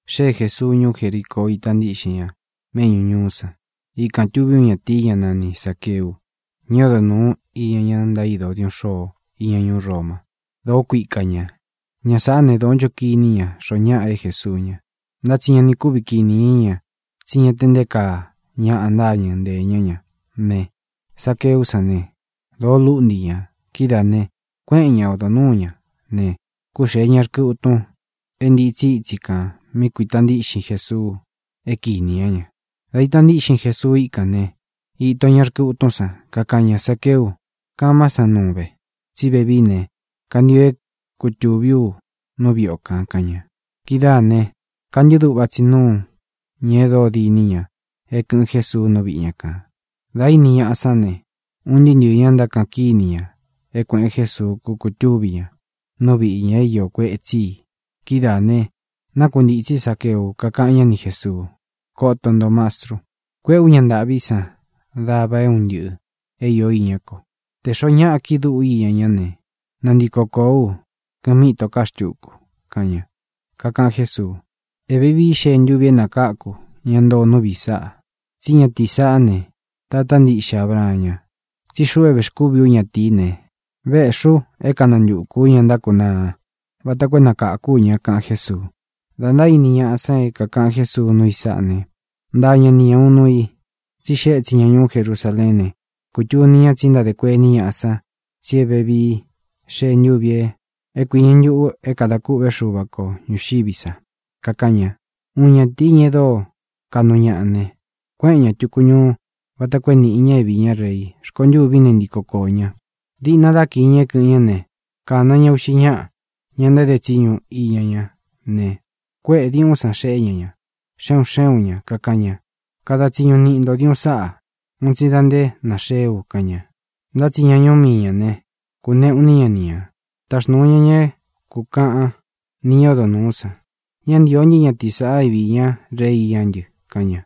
Xée Jēsuu ñuú Jericoo. Ítā ntíꞌxin ña méꞌñū ñuú san. Ikān tuví uun ñatīi, ñá nani Zāqueu, ña é odo nūu iña ña ntaído diuꞌun xôo íña ñuú Roma. Dōó kuika ñā. Ña sāꞌá ne, dōó ncho kiní ña xoo ñáꞌa é Jēsuu ña, ntá tsi ña ni kuvi kiní ña, tsí ña te nté kaa ñaꞌa ntáñɨ nteē ñá ña ne, Zaqueú san ne, dōo lúꞌnti ñā. Kidáā ne, kuéꞌen ña ōdó nuū ña ne, kúxēe ña rkɨ utun é ntitsi ítsi kān mí kuīta ntíꞌxin Jesuu é kinī ñá ña. Dā ita ntíꞌxin Jesuu íkān né, īto ña rkɨ utún san, kakaꞌan ña: —Zaqueu, kamá san nuun ve, tsí vevií ne, kantio é kutūví u nú viꞌi o kān —kaꞌan ña. Kidáā ne, kantɨ́ꞌɨ duꞌva tsī núu ñā e dóo diní ña é kɨ̄ꞌɨn Jesuu nú viꞌi ña kān. Dā íni ñaꞌa sán ne, un ntɨɨ́ ntɨɨ̄ ña ntákaꞌan kíni ña é kuēꞌen Jésuu kúkutúvi ñā nú viꞌī ña é iō kuetsí i. Kidáā ne, nákuntītsí Zaqueu, kakaꞌan ñá ni Jēsuu: —Koto nto, Mastru. Kuéꞌē ú ña ntāꞌví san dava é un ntɨꞌɨ̄ é īó iñá ko. Tē xoó ñaꞌa kiꞌi dúꞌu ú iña ñá ne, nantiko kōó u kɨmi itó ka xtúku —kaꞌan ña. Kakaꞌan Jésuu: —Ē vevií xee ntúvi é nakáku ña ntoo nú viꞌi sāꞌa, tsí ñatīí saꞌá ne, tatá ntiꞌxe Abraan ña. Tsí xuꞌu é vēxkúvi ú ñatīí ne, véꞌxī u é kanantukū ú ña ntákunaa vata koo é nakākú u ña —kaꞌan Jésuu. Dā ntaíni ñaꞌa san é kākaꞌan Jésuu núu i sáꞌa ne, ntaa ña ni ña ūun nuu i, tsí e xee étsin ña ñuú Jerusaleén ne, kūtuni ña tsi ntádē kuení ñaꞌa san tsi é vevií xee ntúvī é kuiñɨ ntuꞌū é kadā kûꞌvé Xuva ko ñūxiví sa. Kakaꞌan ña: —Uun ñatīí, ña e dóo kaꞌnu ñaꞌa ne, kuéꞌen ña tūku ñuu vata koo é nīꞌi ña é viī ñá rei. Rkontûví ne, ntiko koō ñá. Diꞌna dá kiī ña é kɨ̄ꞌɨn ñá ne, kāna ña uꞌxi ñáꞌa, ña ntáde tsiñu iña ñá ne, kuéꞌē diuꞌún san xeꞌé ña ña, xe un xé un ñā, kakaꞌan ña: “Kada tsiñu niꞌi ntō diuꞌun sáꞌa un tsi da nté nāxeé u”, kaꞌan ña. Ntá tsi ña ñuú mii ñā né, kūnéꞌū iní ña ni ñā. Taxnūu ña ña é kūkaꞌan ni ñá odo nūú san: “Ñá ntīo ntɨ́ ñatīí sāꞌa é viī ñá rei iñá ntɨ”, kaꞌan ña.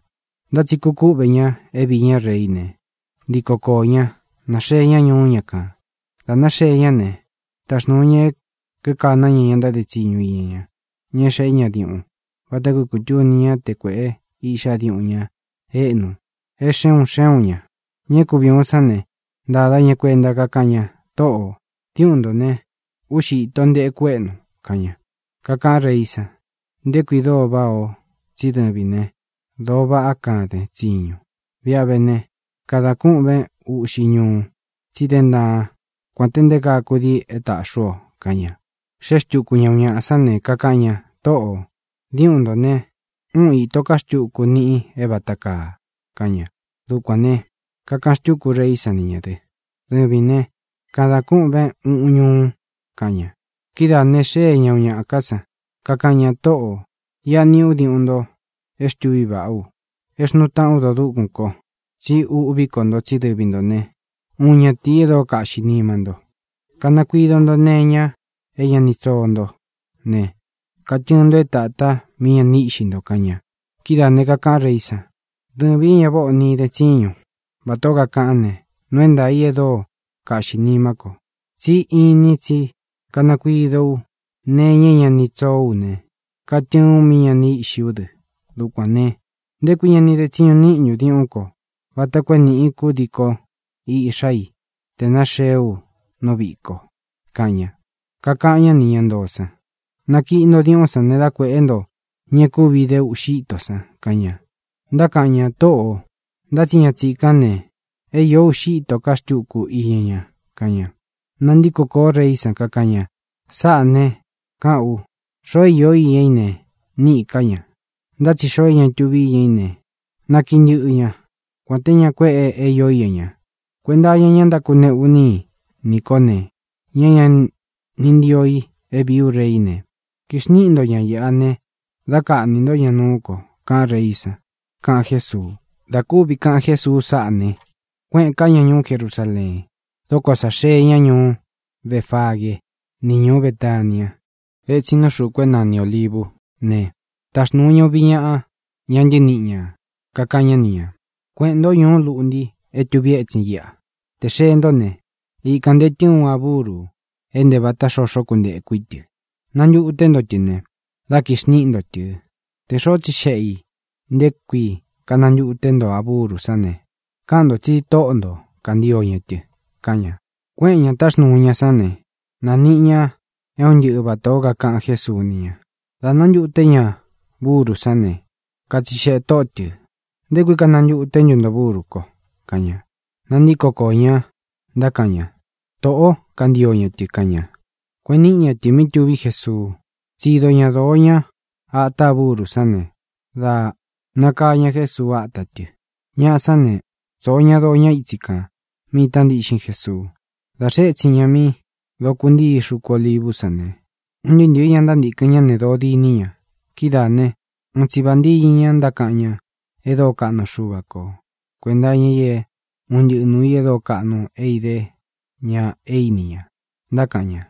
ʼNtá tsi kūkúꞌvē ña é viī ñá reí ne, ntiko koō ña, náxee ña ñuú ña kān. Dā náxee ñá ne, taxnūu ña é kīkaná ña ña ntáde tsiñu iña ña, ña é xēꞌé ña diuꞌun, vata koo é kūtuni ñá te kuēꞌe iꞌxá diuꞌun ña éꞌnu é xe un xé un ñā. Ña é kuvi ūun sán ne, ntāda ña kuenta, kakáꞌan ña: “Tōꞌo, diúꞌun ntō ne, úꞌxi īto nteku éꞌnu”, kaꞌan ña. Kakaꞌán reí san: “Nté kui dóo váꞌā o, tsí dɨvīn né, dōo vaꞌá kaden tsiñun. Viꞌi a vé ne, kadān kúꞌven uꞌxi ñuu, tsi dén ntaan kuān te nté kaa kudii é tāꞌxí u o”, kaꞌan ña. Xée xtuku ña uun ñaꞌa sán ne, kakaꞌan ña: “Tōꞌo, diúꞌun ntō ne, úꞌun īto ká xtuku niꞌi é vāta kaa”, kaꞌan ña. Dukuān ne, kakaꞌan xtúku reí san ni ñā dɨ́: “Dɨvīn ne, kada kûꞌven uꞌun ñúu”, kaꞌan ña. ʼKidáā ne, xée ña uun ñaꞌa ká san, kakaꞌan ña: “Tōꞌo, iꞌa niꞌi ú diuꞌun nto é xtuví vaꞌá u, e xnúu taꞌán u dodúkun ko. Tsí uꞌví ko nto, tsí dɨvi ntō né, uun ñatīi e dóo kaꞌxī nima nto. Kanakuido nto nee iña é ña ni tsoo ntó ne, katɨɨn nto é tāta mí ña ni íꞌxi nto”, kaꞌan ña. Kidáā ne, kakaꞌán reí san: “Dɨvīn é ña váꞌā o ni den tsíñun, vatā ó kakaꞌán ne, nuu é ntaā i e dóo kaꞌxī nimá ko. Tsí inin tsí kanakuido ú nee iña é ña ni tsoó u ne, katɨɨn u mí ña ni íꞌxi ú dɨ. Dukuān ne, ¿nté kui ña ni de tsiñu níꞌin ntun diuꞌún ko vata koo é nīꞌi kúdii kó iꞌxá i tē náxeé u nú viꞌī ko?”, kaꞌan ña. Kakaꞌan ñá nī ña ntoo san: “Nakiꞌi nto diuꞌún san ne, dá kuēꞌé nto ña é kuvi ide uꞌxi íto san”, kaꞌan ña. Ntákaꞌan ña: “Tōꞌo, ntá tsi ña tsīkán ne, é io ūꞌxi íto ká xtuku iña ña”, kaꞌan ña. Nantíko kōó reí san, kakaꞌan ña: “Sáꞌā ne, káꞌān u: Xoo é iō iña í ne, níꞌī ká ña, ntá tsi xoo é ña tuvi íña í ne, nakíꞌi ntɨꞌɨ ña, kuān té ña kuéꞌe é iō íña ña. Kuenta iña ña é ntákuneꞌu iní i nī kó ne, ña é ña ni ntio i é viī ú reí ne, kixníꞌi nto ña īꞌa ne, dá kaꞌnī ntó ña nuú ko”, kaꞌán reí san —kaꞌan Jésuu. Dā kúvi kaꞌan Jésuu sáꞌā ne, kuéꞌēn ká ña ñuú Jerusaleen. Dā dokó sa xee ña ñuú Befagee ni ñuú Betaniá etsin nú xūku é nani Ōlivú ne, taxnūu ña uvi ñaꞌa, ñá ntɨniꞌi ñā, kakaꞌan ñá ni ñā: —Kueꞌēn ntó ñuú luꞌnti é tūvi étsin iꞌa. Tē xee ntó ne, ikān ntee tɨɨn uun a búru é ntē vata xoxó kuntēku í tɨ. Nantuté nto tɨ ne, dá kixniꞌi nto tɨ̄. Tē xoó tsixeꞌe ī nté kui kanantuté nto a búru sán ne, káꞌan ntō tsi Tóꞌo nto kāntio ña tɨ —kaꞌan ña. Kuéꞌen ñā táxnuu ña san ne, nāniꞌi ña é un ntɨꞌɨ vatā ó kakaꞌan Jésuu ni ña. Dā nántuté ña burú san ne, katsixeꞌē tóꞌo tɨ̄: —¿Nté kui kanantuté ntu nto burú ko? —kaꞌan ña. Nantíko koō ña, ntákaꞌan ña: —Tōꞌó kāntio ña tɨ —kaꞌan ña. Kueꞌen níꞌi ña tɨ̄ mí tuví Jesuu. Tsido ña dōo ñá ata a búru sán ne, dā nakaa ña Jésuu áta tɨ. Ñaꞌa sán ne, tsōo ña doo ña ítsi kān mí ita ntíꞌxin Jesuu. Dā xee étsin ña mí dokuntíi xuku Olívu sán ne, un ntɨɨ́ ntɨ̄ɨ́ ña ntántīkɨn ñá ne, dōo diní ña. Kidáā né, uun tsi vāntiñɨ ña ntákaꞌan ñá e dóo kaꞌnu Xuva ko kuēnta iña i é un ntɨꞌɨ nūu i e dóo kaꞌnu é idé ña e íni ña. Ntákaꞌan ña: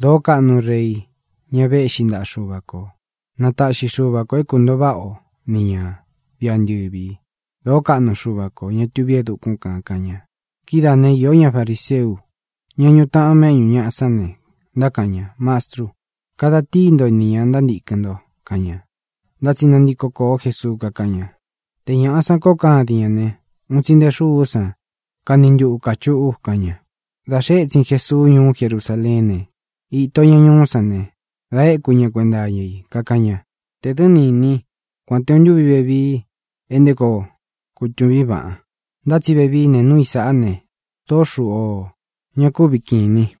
—¡Dōó kaꞌnu Rei, ñá vēꞌxí ntaꞌa Xuva kō! ¡Na taꞌxi Xuva kō é kuntoo váꞌa o ni ñā viꞌi antɨvi! ¡Dōó kaꞌnu Xuva ko, ñā tuví e dukún kān! —kaꞌan ña. Kidáa ne, iō ñá fariseú, ña ñuꞌu taꞌan méꞌñu ñāꞌa sán ne, ntákaꞌan ña: —Mastru, kada tíi nto nī ña ntántīkɨn nto —kaꞌan ña. Ntá tsi nantiko kōo Jesuu, kakáꞌan ña: —Te ñāꞌa san koo kádin ñā ne, un tsi nte xúú san kani ntuꞌu kāchuꞌu —kaꞌan ña. Dā xee étsin Jesuu ñuú Jerusaleén ne, īto ña ñuú san ne, da éku ña kuénta iña í, kakaꞌan ña: —¡Tē dɨ́ ni īnín kuān te uun ntúvi vevii e nté koo kutūvín vaꞌan! Ntá tsi vevií ne, núu i sāꞌá ne, dōó xuꞌu íō. Ña kúvi kīnin.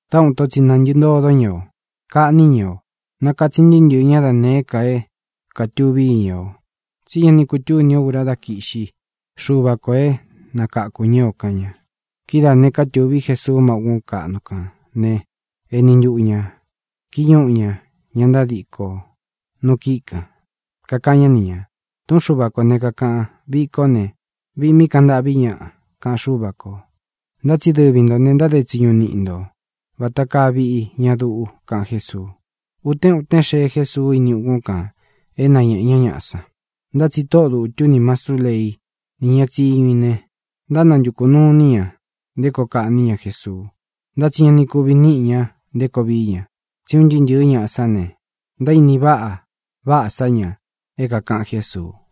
Dá uun ito tsi nāntɨꞌɨ ntodó ña o. Kaꞌní ña ñaꞌa o. Nākatsin ntɨɨ́ ntɨɨ̄ ñá da nēé ka e kátūví iña o, tsí ña ni kutúni ō ura dá kiꞌxí Xuva kō é nakakū ñá o —kaꞌan ña. Kidáā ne, kúkɨ̄ꞌví Jesuu má ukún kaꞌnu kān né, eni ntuꞌu ñā kíñuꞌu ñā ña ntádikō nu kíꞌi kān. Kakaꞌan ñá ni ñā: —Tūꞌún Xuva kō ne, kakaꞌan: “Viꞌi kó ne, viꞌi mí kaꞌan ntâꞌví ñaꞌa”, kaꞌan Xúva kō. Ntá tsi dɨvi ntō ne, ntáde tsiñu niꞌi nto vata kaa viꞌi ña duꞌu —kaꞌan Jésuu. Utén utén xee Jésuu ini ukún kān é nañēꞌe ñá ñaꞌa san. Ntá tsi tóꞌo dūtu ni mastrú lei, ni ña tsíñu i ne, ntánantukū nuu iní ña nté koo kaꞌní ña Jesuu. Ntá tsi ña ni kuvi níꞌi ña nté koo vií ña, tsí un ntɨɨ́ ntɨ̄ɨ́ ñaꞌa sán ne, ntaíni va váꞌa sa ña é kākaꞌan Jésuu.